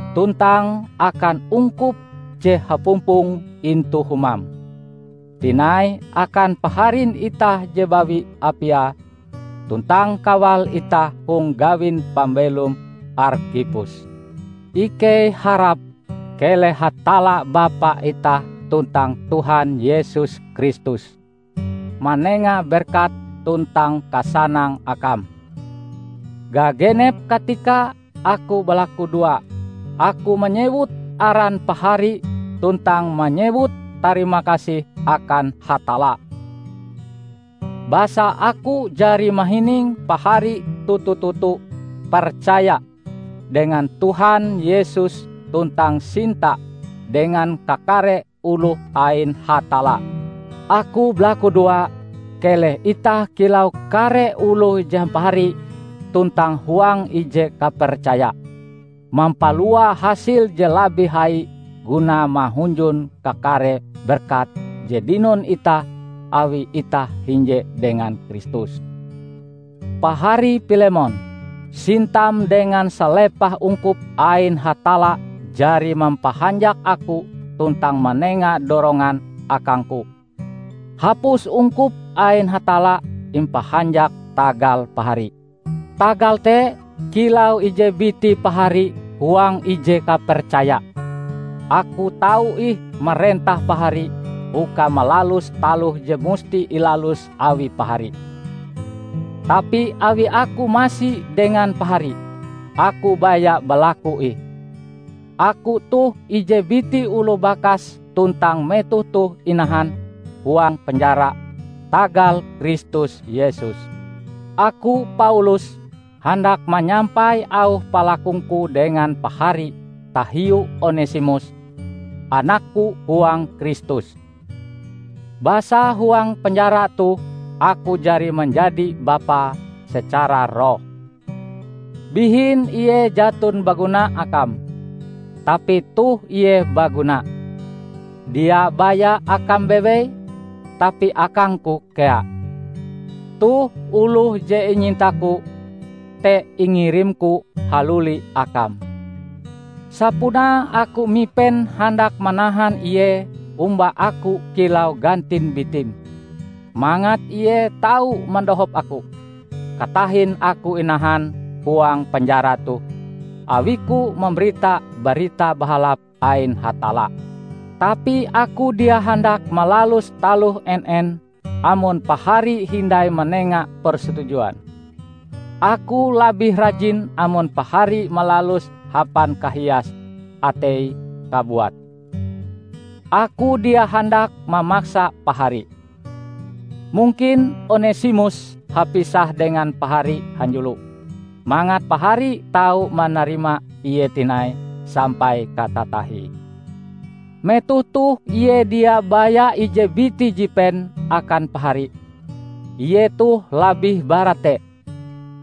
tuntang akan ungkup je hapumpong intu humam; tinai akan paharin itah je bawi Apia, tuntang kawal itah hong gawin pambelom, Arkhipus. Ikei harap keleh Hatalla Bapa itah tuntang Tuhan Yesus Kristus manenga berkat tuntang kasanang akam. Gagenep katika aku balakudoa, aku manyewut aran pahari tuntang manyewut tarimakasih akan Hatalla. Basa aku jari mahining pahari toto-toto percaya dengan Tuhan Yesus tuntang sinta dengan kakare oloh ain Hatalla. Aku balakudoa keleh itah kilau kare oloh je hampahari tuntang huang ije kapercaya, mampalua hasil je labih hai gunae mahunjun kakare berkat je dinon itah awi itah hinje dengan Kristus. Pahari Pilemon, sintam dengan salepah ungkup ain Hatalla jari mampahanjak aku tuntang manenga dorongan akangku! Hapus ungkup ain Hatalla impahanjak tagal pahari. Tagal te, kilau ije biti pahari huang ije kapercaya, aku tau ih marentah pahari uka malalus taloh je musti ilalus awi pahari. Tapi awi aku masi dengan pahari, aku baya balaku ih. Aku toh ije biti oloh bakas tuntang metoh toh inahan huang penjara tagal Kristus Yesus. Aku, Paulus, handak manyampai auh palakungku dengan pahari tahiu Onesimus, anakku huang Kristus. Basa huang penjara toh aku jari manjadi bapae secara roh. Bihin ie jaton baguna akam, tapi toh ie baguna, dia baya akam bewei, tapi akangku kea. Toh oloh je inyintaku te ingirimku haluli akam. Sapunae aku mipen handak manahan ie omba aku kilau gantin bitim, mangat ie tau madohop aku, katahin aku inahan huang penjara toh awiku mambarita Barita Bahalap ain Hatalla. Tapi aku dia handak malalus taloh en-en amon pahari hindai manenga persetujuan. Aku labih rajin amon pahari malaluse hapan kahias atei kabuat; aku dia handak mamaksa pahari. Mungkin Onesimus hapisah dengan pahari hanjulo mangat pahari tau manarima ie tinai sampai katatahie. Metoh toh ie dia baya ije biti jipen akan pahari; ie toh labih bara te.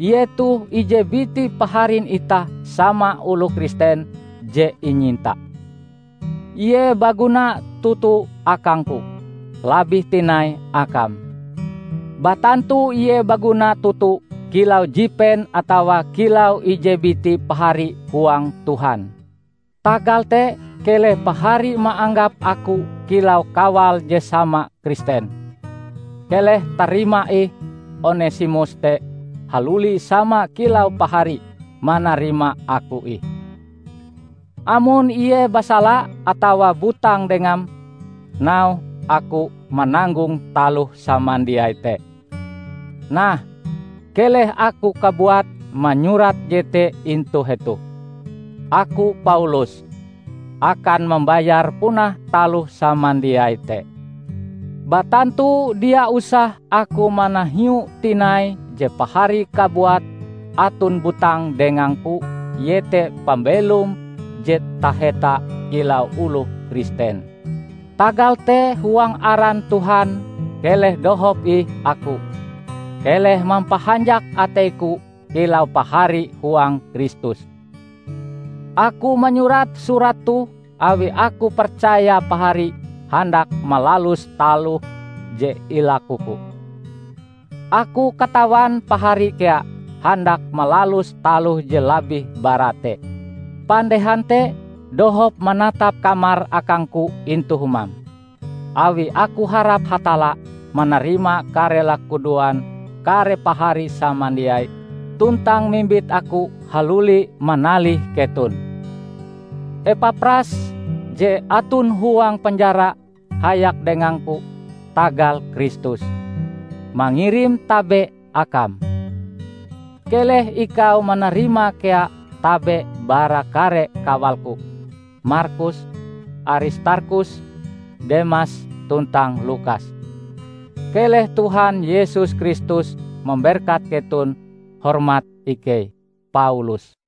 Ie toh ije biti paharin itah sama oloh Kristen je inyinta. Ie baguna toto akangku, labih tinai akam! Batantu ie baguna toto kilau jipen atawa kilau ije biti pahari huang Tuhan. Tagal te, keleh pahari maanggap aku kilau kawal je sama Kristen, keleh tarima ih Onesimus te haluli sama kilau pahari manarima aku ih. Amon ie basala atawa butang dengam, nauhe aku mananggong taloh samandiai te. Nah, keleh aku kabuat manyurat jete intu hetoh: Aku Paulus, akan mambayar punah taloh samandiai te. (Batantu dia usah aku manahiue tinai je pahari kabuat aton butang dengangku iete pambelom je taheta kilau oloh Kristen.) Tagal te huang aran Tuhan keleh dohop ih aku, keleh mampahanjak ateiku kilau pahari huang Kristus. Aku manyurat surat toh awi aku percaya pahari handak malalus taloh je ilakuku. Aku katawan pahari kea handak malalus taloh je labih bara te. Pandehan te, dohop manatap kamar akangku intu humam, awi aku harap Hatalla manarima kare lakudoan kare pahari samandiai tuntang mimbit aku haluli manalih keton. Epapras, je aton huang penjara hayak dengangku tagal Kristus, mangirim tabe akam. Keleh ikau manarima kea tabe bara kare kawalku: Markus, Aristarkhus, Demas tuntang Lukas. Keleh Tuhan Yesus Kristus mamberkat ketonb Hormat ikei, Paulus